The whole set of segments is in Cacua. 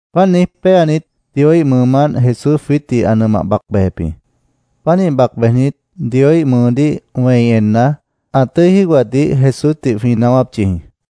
Páant niíj péanit, Dioíh mʉʉmánt Jesús jwiítdih ã nʉmah bac bejep jĩ. Pánih bac bejnit, Dioíh mʉʉdíh wẽi enna, ã tʉ́i jígohatdih Jesúsdih jwĩ naáwáp yʉh jĩ.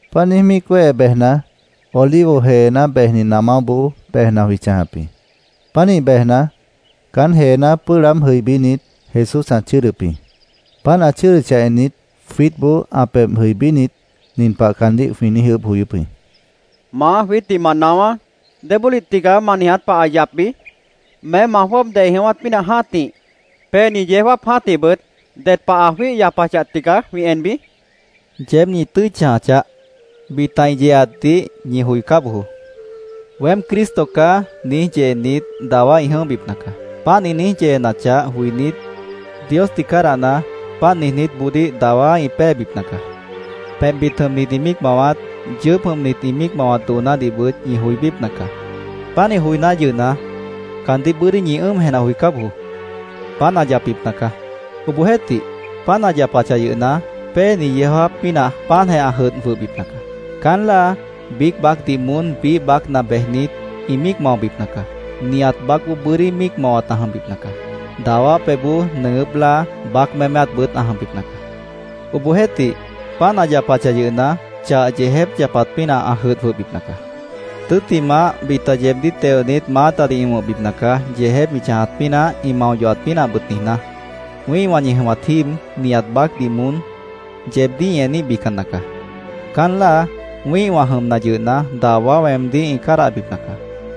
Páant niíj míic wéhe bejna, Olivo jeená bejni namáboó bejna jwĩ chãjap jĩ. Pánih bejna, caán jeená pʉ́ʉh laáb jʉibínit, Jesús ã chʉ́ʉdʉp jĩ. Páant ã chʉ́ʉdʉchah ennit, jwiítboó ã pebh jʉibínit, nin pah caandíh jwĩ niíj ʉʉ́bh joyóp jĩ: —Maá, jwiítdih ma naáwá. ¿Débólih tigaá ma niiját pah ã yapbi? ¿Meém ma jwʉ́ʉb dei jʉ̃ʉ́wát pínah jã́tih, péeni yeó jáap jã́tihbʉt ded pah ã jwíih yapachah tigaá jwĩ enbi? jwĩ niijíp jĩ. —Yeéb ñi tʉ́i chãja chaáh. Bita ĩ yeeatdih ñi joicá bojoó. ‘Weém Cristo caá’, niíj yeenit, dawá ĩ jʉ̃óhbipna caá. Páant ĩ niíj yeenachah joinít, Diosdih cádahna, páant niijnítboodíh dawá ĩ péebipna caá. Pebhbit jʉmnit ĩ míic mawat, yʉʉ́p jʉmnit ĩ míic mawat doonádihbʉt ñi joibípna caá. Pánih joiná yʉhna, caandíh bʉ́dí ñi ʉ́ʉm jenah joicá bojoó. Páant ã yapbipna caá. Obohjeéhtih, páant ã yapachah yʉhna, péeni yeó jáap pínah páantjeh ã jʉdh jwʉhbipna caá. Caán láa biíc baácdih moón biíh baácna bejnit, ĩ míic maobipna caá. Nihat baácboó bʉ́dí míic mawat ã jʉmbipna caá. Dawá pebhboó nʉʉgʉ́p láa, baác méméatbʉt ã jʉmbipna caá. Obohjeéhtih, páant ã yapachah yʉhna, chah yeejép yapat pínah ã jʉdh jwʉhbipna caá. “Tʉ́ttimah, bita yeebdíh teonit, maátadih ĩ wʉ̃hbipna caá, yeejép ĩ chãjat pínah, ĩ mao yohat pínahbʉt niijná. Wĩ́ihwã ñi jʉmat jíib, nihat baácdih moón yeebdíh ĩ eníhbican nacaá. Caán láa, wĩ́ihwã jʉmna yʉhna, dawá weemdíh ĩ cádahbipna caá.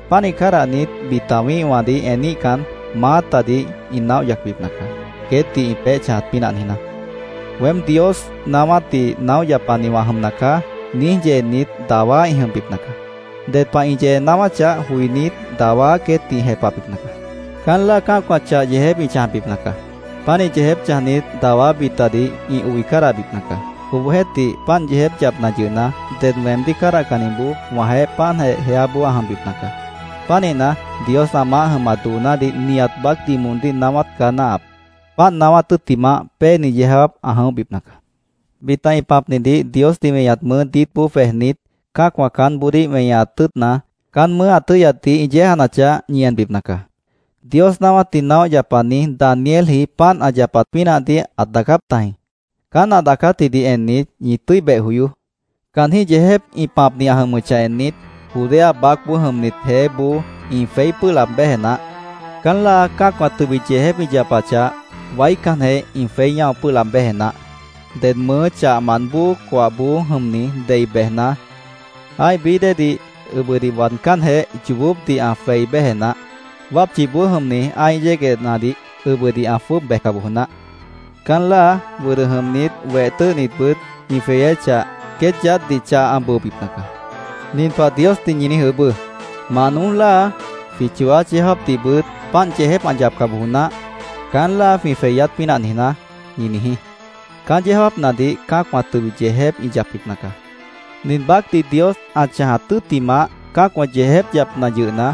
Pánih cádahnit, bita wĩ́ihwãdih eníhcan, maátadih ĩ naóh yacbipna caá, queétdih ĩ peéh chãjat pínah niijná. ‘Weém Dios naáwátdih naóh yapani wã jʉmna caá’, niíj yeenit dawá ĩ jʉmbipna caá. Ded pah ĩ yee naáwáchah joinít, dawá queétdih ĩ jepahbipna caá. Caán láa cã́acwã chah yeejép ĩ chãjbipna caá. Pánih yeejép chãjnit, dawá bitadih ĩ oi cádahbipna caá. Obohjeéhtih, páant yeejép yapna yʉhna, ded weemdíh cádahcanniboó wãjeéh páantjeh jeáboó ã jʉmbipna caá. Pánihna, Dios ã maáh jʉmat doonádih nihat baácdih moondíh naáwát caá náahap. Páant naáwát tʉ́ttimah, péeni yeó jáap ã jʉ̃óhbipna caá. “Bita ĩ pãpnidih Diosdih weñat mʉʉ́ diítboó jwejnit, cã́acwã caánboodíh weñaat tʉ́ʉtna, caán mʉʉ́ ã tʉ́yatdih ĩ yéejanachah, ñi enbipna caá. Dios naáwátdih naóh yapani Danielji páant ã yapat pínahdih ãt daacáp tajĩ. Caán ã daacátjidih ennit, ñi tʉ́i beh joyoó. Caanjĩ́h yeejép ĩ pãpni ã jʉmʉchah ennit, Judea baácboó jʉmnit jeéboó ĩ jweí pʉ́ʉh laab béje naáh. Caán láa cã́acwã tʉbit yeejép ĩ yapachah, waícanjeh ĩ jweí ñáo pʉ́ʉh laab béje naáh. Ded mʉʉ́ chahmant bóo coahboó jʉmni dei bejna, ã́ih bií déedih ʉbʉdih waadcánjeh, yoobópdih ã jwei béje naáh. Wápchiboó jʉmni ã́ih yéguehnadih ʉbʉdih ã jwʉ́ʉb bejca bojo naáh. Caán láa wʉdʉ jʉmnit, weh tʉ́ʉhnitbʉt ĩ jweyéchah, queét yaádhdih chah ã bʉobipna caá. Nin pah Diosdih ñi niíj ʉʉ́bʉ́: ‘Mah noój láa, jwĩ chooát yeó jáapdihbʉt páant yeejép ã yapca bojo naáh, caán láa jwĩ jweyát pínah niijná’, ñi niijí. Caán yeó jáapnadih cã́acwã tʉbit yeejép ĩ yapbipna caá. Nin baácdih Dios ã chãjat tʉ́ttimah, cã́acwã yeejép yapna yʉhna,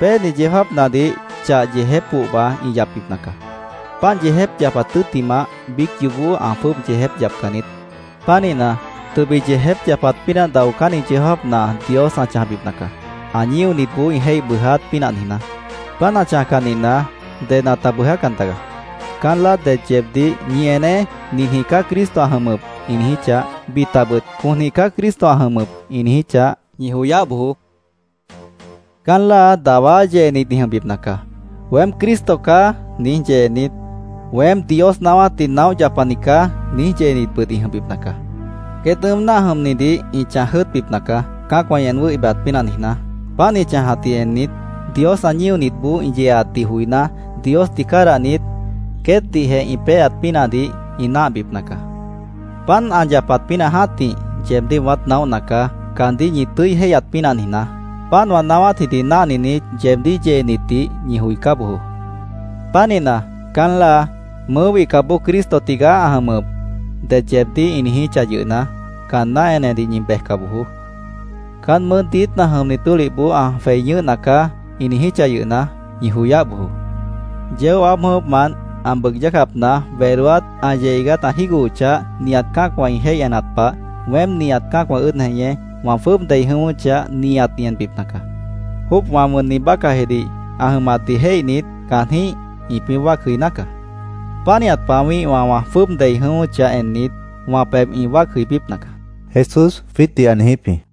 péeni yeó jáapnadih chah yeejép pohba ĩ yapbipna caá.Páant yeejép yapat tʉ́ttimah, biíc yoobó ã jwʉ́ʉb yeejép yapcan niít. Pánihna, tʉbit yeejép yapat pínah daocánni yeó jáapna Dios ã chãjbipna caá, ã ñíonitboó ĩ jéih bʉʉjáát pínah niijná. Páant ã chãjcah nihna, ded ãta bʉʉjácan tagaá. “Caán láa det yeebdíh ‘Ñi eneé. Ninjĩh caá Cristo ã jʉmʉp’, ĩ niijíchah, bitabʉt ‘Conjĩh caá Cristo ã jʉmʉp’, ĩ niijíchah, ñi joyáh bojoó. Caán láa dawá yeenit ĩ jʉmbipna caá. ‘Weém Cristo caá’, niíj yeenit, ‘Weém Dios naáwátdih naóh yapani caá’, niíj yeenitbʉt ĩ jʉmbipna caá. Queét ʉ́ʉm náah jʉmnidih ĩ chãj jʉ́ʉtbipna caá, cã́acwã ĩ en wʉ́hi bejat pínah niijná. Páant ĩ chãjatdih ennit, Dios ã ñíonitboó ĩ yeeatdih joiná, Diosdih cádahnit, queétdihjeh ĩ péeat pínahdih ĩ náahbipna caá. Páant ã yapat pínah jã́tih, yeebdíh wãát naóhna caá, caandíh ñi tʉ́i jéihyat pínah niijná. Páant wã naáwátjidih náhninit, yeebdíh yeenitdih ñi joicá bojoó. Pánihna, caán láa ‘Mʉʉ́ wihcapboó Cristo tigaá ã jʉmʉp’, det yeebdíh ĩ niijíchah yʉhna, caanná enedih ñi bejca bojoó. ‘Caán mʉʉ́ diítna jʉmni tólihboó ã jwei ñʉ́hna caá’, ĩ niijíchah yʉhna, ñi joyáh bojoó. Yeó aáb jʉ̃ʉ́wʉ́pmant ã bʉʉg yácapna wedóát ã yeh iigát ã jígohochah, nihat cã́acwã ĩ jéih enat pah, weém, nihat cã́acwã ʉ́ʉd jeñé, wã jwʉ́ʉb dei jʉ̃ʉ́wʉ́chah, nihat ĩ enbipna caá. Jóopwã wʉnni bácahjidih ã jʉmatdih jéihnit, caanjĩ́h ĩpĩ́ wáac jʉiná caá. Pánihat pah wĩ́ihwã wã jwʉ́ʉb dei jʉ̃ʉ́wʉ́chah ennit, wã pebh ĩ wáac jʉibípna caá”, Jesús jwiítdih ã niijíp jĩ.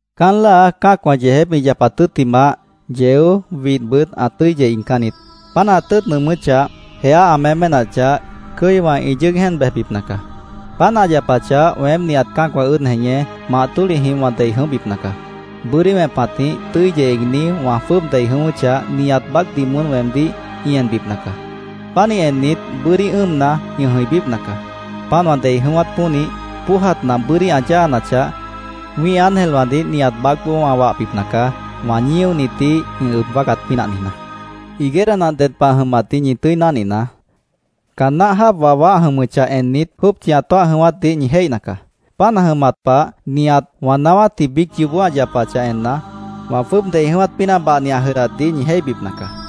“Caán láa cã́acwã yeejép ĩ yapat tʉ́ttimah, yeó, widhbʉt ã tʉ́i yeh iigcán niít. Páant ã tʉ́ʉt nʉʉmʉ́chah, jeá ã méménachah, cʉ́iwã ĩ yʉ́ʉg jéen bejbipna caá. Páant ã yapachah, weém nihat cã́acwã ʉ́ʉd jeñé, mah tólihjih wã dei jʉ̃óhbipna caá. Bʉ́dí wẽpatjĩh, tʉ́i yeh iigní wã jwʉ́ʉb dei jʉ̃ʉ́wʉ́chah, nihat baácdih moón weemdíh ĩ enbipna caá. Pánih ennit, bʉ́dí ʉ́ʉmna, ĩ jʉ̃ibípna caá. Páant wã dei jʉ̃ʉ́wát pónih, póojat nah bʉ́dí ã yáanachah, wĩ́ih ángelwãdih nihat baácboó wã wahbipna caá, wã ñíonitdih ĩ ʉb wáacat pínah niijná. “Higuera nah ded pah ã jʉmatdih ñi tʉ́i náhninaá. Caan náh jáap wawá ã jʉmʉchah ennit, jópchi ã tóah jʉ̃ʉ́wátdih ñi jéihna caá. Páant ã jʉmat pah, nihat wã niijátji biíc yoobó ã yapachah enna, wã jwʉ́ʉb dei jʉ̃ʉ́wát pínah bahni ã jʉdhdatdih ñi jéihbipna caá.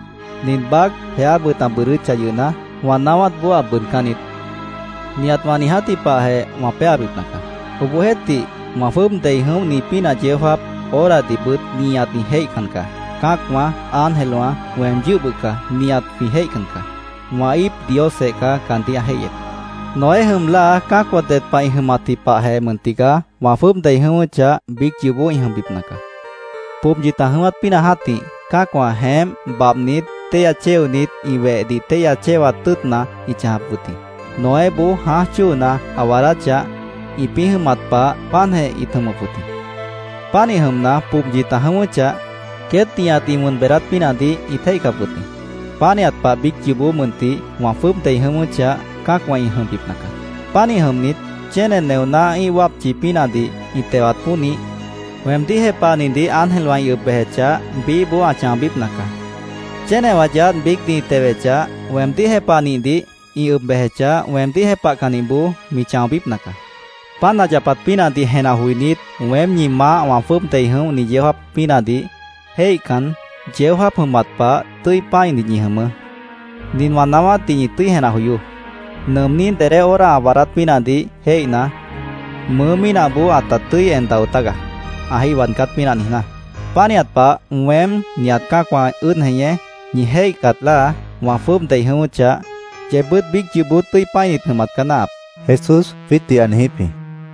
Nin baác, jeábʉt ã bʉʉdʉ́chah yʉhna, wã naáwátboó ã bʉʉdcán niít. Nihat wã niijátji pahjeh wã péabipna caá. “Obohjeéhtih, wã jwʉ́ʉb dei jʉ̃óhni pínah yeó jáap, horadihbʉt nihat ĩ jéihcan caá. Cã́acwã, ángelwã, weem yʉ́h bʉca nihat jwĩ jéihcan caá. Wã íip Diosjeh caá caandíh ã jéihyep. “Noé jʉm láa cã́acwã ded pah ĩ jʉmatji pahjeh mʉn tigaá wã jwʉ́ʉb dei jʉ̃ʉ́wʉ́chah, biíc yoobó ĩ jʉmbipna caá. Pobyit ã jʉ̃ʉ́wát pínah jã́tih cã́acwã jeémp babhnit, téihya chéonit, ĩ wehdih téihya chéwat tʉ́ʉtna ĩt chãjap wʉt jĩ. Noéboó jãáj chóona ã waadáchah, ĩpĩ́ jʉmat pah, páantjeh ĩt jʉmʉp wʉt jĩ. Pánih jʉmna, pobyit ã jʉ̃ʉ́wʉ́chah, queét nihat ĩ wʉn beedáát pínahdih ĩt jéihcap wʉt jĩ. Pánihat pah biíc yoobó mʉntih wã jwʉ́ʉb dei jʉ̃ʉ́wʉ́chah, cã́acwã ĩ jʉmbipna caá. Pánih jʉmnit, chéne neoná ĩ́ih wápchi pínahdih ĩ tewat pónih, weemdíh jepahnidih ángelwã ĩ ʉb bejechah, biíhboó ã chãobípna caá. Chénewã yaádh biícdih ĩ tewechah, weemdíh jepahnihdih ĩ ʉb bejechah, weemdíh jepahcannihboó mi chãobípna caá. “Páant ã yapat pínahdih jenah joinít, weém ñi Maáh wã jwʉ́ʉb dei jʉ̃óhni yeó jáap pínahdih jéihcan, yeó jáap jʉmat pah tʉ́i pã́init ñi jʉmʉʉ́. Nin wã naáwátdih ñi tʉ́i jenah joyoó: Nʉʉmní dedé hora ã waadát pínahdih jéihna, mʉʉ́ mínahboó ãta tʉ́i en dao tágaá, ã jéih waadcát pínah niijná. Pánihat pah weém, nihat cã́acwã ʉ́ʉd jeñé, ñi jéihcat láa wã jwʉ́ʉb dei jʉ̃ʉ́wʉ́chah, yeebbʉ́t biíc yoobó tʉ́i pã́init jʉmat caá náahap”, Jesús jwiítdih ã niijíp jĩ.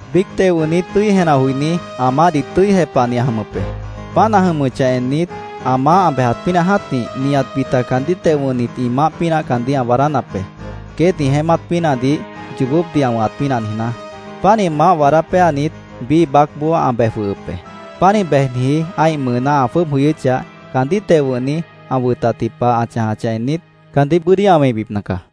“Biíc teo wʉ̃hni tʉ́i jenah joiní, ã maáhdih tʉ́i jepahni ã jʉmʉp be. Páant ã jʉmʉchah ennit, ã maáh ã bejat pínah jã́tih, nihat bita caandíh teo wʉ̃hnit ĩ maáh pínah caandíh ã waadánap be, queét ĩ jeémát pínahdih yoobópdih ã wʉ̃hat pínah niijná. Pánih maáh waadá péanit, biíh baácboó ã bej jwʉhʉp be. Pánih bejniji ã́ih mʉʉná ã jwʉ́ʉb jʉyʉ́chah, caandíh teo wʉ̃hni ã wʉtatji pah ã chãjachah ennit, caandíh bʉ́dí ã wẽibipna caá.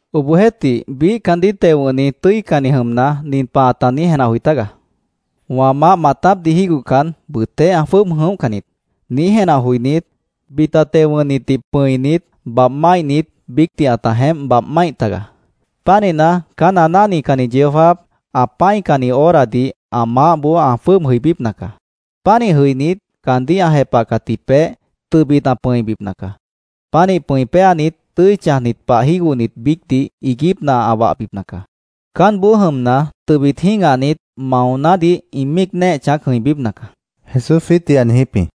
Obohjeéhtih, biíh caandíh teo wʉ̃hni tʉ́icanni jʉmna, nin pah ãta niíj jenah joi tágaá: ‘Wã maáh maatápdih jígohcan, bʉʉtéh ã jwʉ́ʉb jʉ̃óhcan niít’, niíj jenah joinít, bita teo wʉ̃hnitdih pʉ̃init, babh máihnit biícdih ãta jeémp babh máih tagaá. Pánihna, caán ã náhnicanni yeó jáap, ã pã́icanni horadih ã maáhboó ã jwʉ́ʉb jʉibípna caá. Pánih jʉinít, caandíh ã jepahcatji peéh, tʉbit ã pʉ̃ibipna caá. Pánih pʉ̃i péanit, tʉ́i chãjnit pah jígohnit biícdih, iiguípna ã wahbipna caá. Caánboó jʉmna, tʉbit jĩ́gahnit, maonádih ĩ míic néeh chãác jʉ̃ibípna caá”, Jesús jwiítdih ã niijíp jĩ.